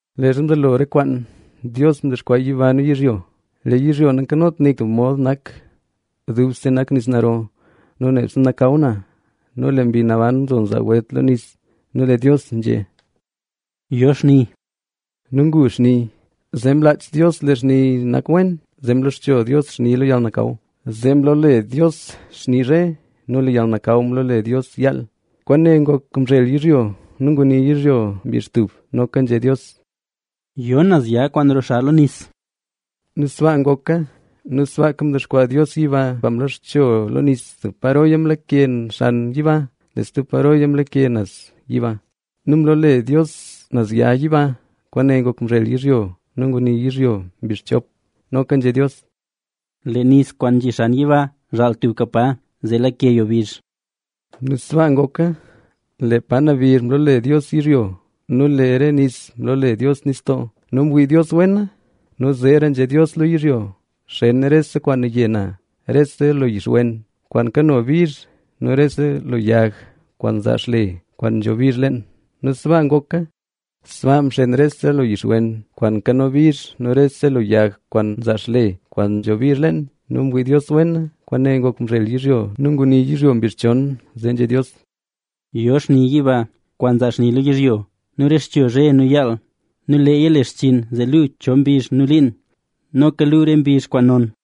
Leezha mzelo re kwaan Dios mdexkwaa yiba nu yizhyo. Lee yzhyo nankanot nik tub mod nak; dubse nak nis naro nu nebse nakaw na. Nu lee Mbi Naban nzo nzaa welt lo nis. Nu lee Dios nzhé: “Yo xni”. Nu ngu xni. Zee mlaach Dios lee xni nak wen. Zee mloxcho Dios xni lo yalnakaw. Zee mloole Dios xni “zhe” nu lee yalnakaw mloole Dios “yaal”. Kwaane ngok mzhel yizhyo nu nguni yizhyo mbizh yilotlaka. Nu noka nzhé Dios: “Yo naz ya kwaan roxa lo nis”. Nu sbaa ngoka. Nu sbaaka mdexkwaa Dios yiba kwaan mloxcho lo nis, tub paroya mlake xan yiba, lee stub paroya mlake naz yiba. Nu mloole Dios naz ya “yiba”. Kwaane ngok mzhel yizhyo nu nguni yizhyo mbizh rop. Noka nzhé Dios: “Lee nis kwaan nzhi xan yiba zhaal tubka pa, zee lake yo bizh”. Nu sbaa ngoka. Lee pa nabizh mloole Dios “yizhyo” nu lee re nis mloole Dios “nistoo”. Nu mwii Dios wena. Nu zeera nzhé Dios lo yizhyo: “Xen rese kwaan naye na, rese lo yix wen kwaan nkano bizh nu rese lo yag kwaan nzaa xle kwaan nzho bizh leen”. Nu sbaa ngoka. Sbaa mxen rese lo yix wen kwaan nkano bizh nu rese lo yag kwaan nzaa xle kwaan nzho bizh leen. Nu mwii Dios wena. Kwaane ngok mzhel yizhyo nu nguni yizhyo mbizh yon. Zee nzhé Dios: “Yo xni yiba, kwaan zaa xni lo yizhyo nu rexcho zhe nu yaal. Nu leeya le xchinn zee luu cho mbizh nu cho liin. Noka luu re mbizh kwaan non.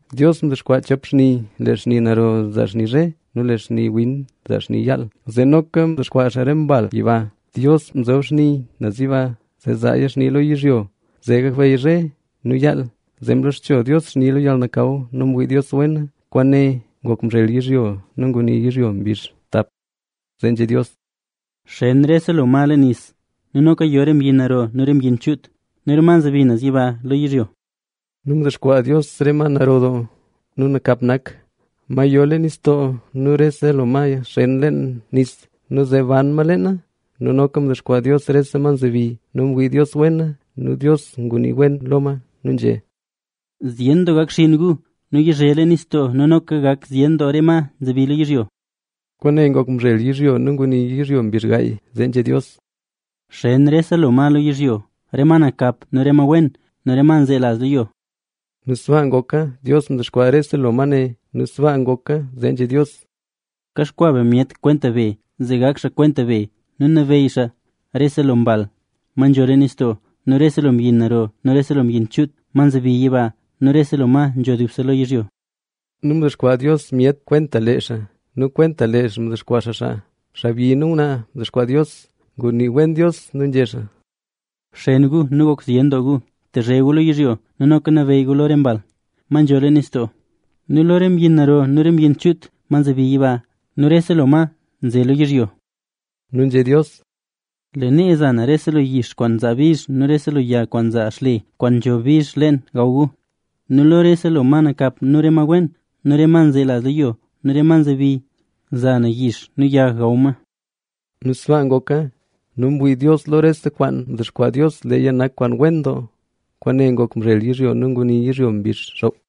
Dios mdexkwaa chop xni: lee xni naro zaa xni zhe nu lee kwaan win zaa xni yaal; zee noka mdexkwaa xaa re mbal yiba. Dios mzob re xni naz yiba, zee zaaya xni lo yizhyo, zee gakbeyy zhe nu yaal; zee mloxcho Dios xni lo yalnakaw. Nu mwii Dios wena. Kwaane ngok mzhel yizhyo nu nguni yizhyo mbizh dap. Zee nzhé Dios: “Xen rese lo ma leen nis; nu noka yo re mbyin naro nu re mbyin chuut nu re ma nzebi naz yiba lo yizhyo”. Nu mdexkwaa Dios re ma naro doo nu nakap nak, ma yo leen nistoo nu rese lo ma xen leen nis; nu zee ban ma leena. Nu noka mdexkwaa Dios rese ma nzebi. Nu mwii Dios wena. Nu Dios ngunii wen lo ma nu nzhé xaa: “Zyen doo gak xinn gu nu yizhe leen nistoo; nu noka gak zyen doo re ma nzebi lo yizhyo”. Kwaane ngok mzhel yizhyo nu nguni yizhyo mbizh gaay. Zee Dios nzhé: “Xen rese lo ma lo yizhyo, re ma nakap nu re ma wen nu re ma nzelaz lo yo”. Nu sbaa ngoka. Dios mdexkwaa rese lo ma ne. Nu mwii Dios wena. Nu zee nzhé Dios: “Kaxkwaa be myet kwenta be, zee gak xaa kwenta be. Nu nabeyy xaa lo rese lo mbal, ma nzho leen nistoo; nu rese lo mbyin naro nu rese lo mbyin chuut, ma nzebi yiba nu rese lo ma nzho dubse lo yizhyo.” Nu mdexkwaa Dios myet kwenta lee xaa; nu kwenta lee xaa mdexkwaa xaa xaa, xaabyi nu ngwnaa mdexkwaa Dios. Ngunii wen Dios nu nzhé xaa: “Bxen gu nu gok zyen doo gu, tezhe gu lo yizhyo. Nu noka nabeyy gu lo re mbal, ma nzho leen nistoo nu lo re mbyin naro nu re mbyin chuut, ma nzebi yiba; nu rese lo ma nze lo yizhyo.” Nu nzhé Dios: “Lee nal za na rese lo yix kwaan nzaa bizh nu rese lo yag kwaan nzaa xle kwaan nzho mbizh leen gaw gu. Nu rese lo re ma nakap nu re ma wen nu re ma nzelaz lo yo nu re ma nzebi, za na yix nu yag gaw ma.” Nu sbaa ngoka. Nu mwii Dios lo rese kwaan mdexkwaa Dios leeya nak kwaan wen doo. Kwaane ngok mzhel yizhyo nu nguni yizhyo mbizh xoop.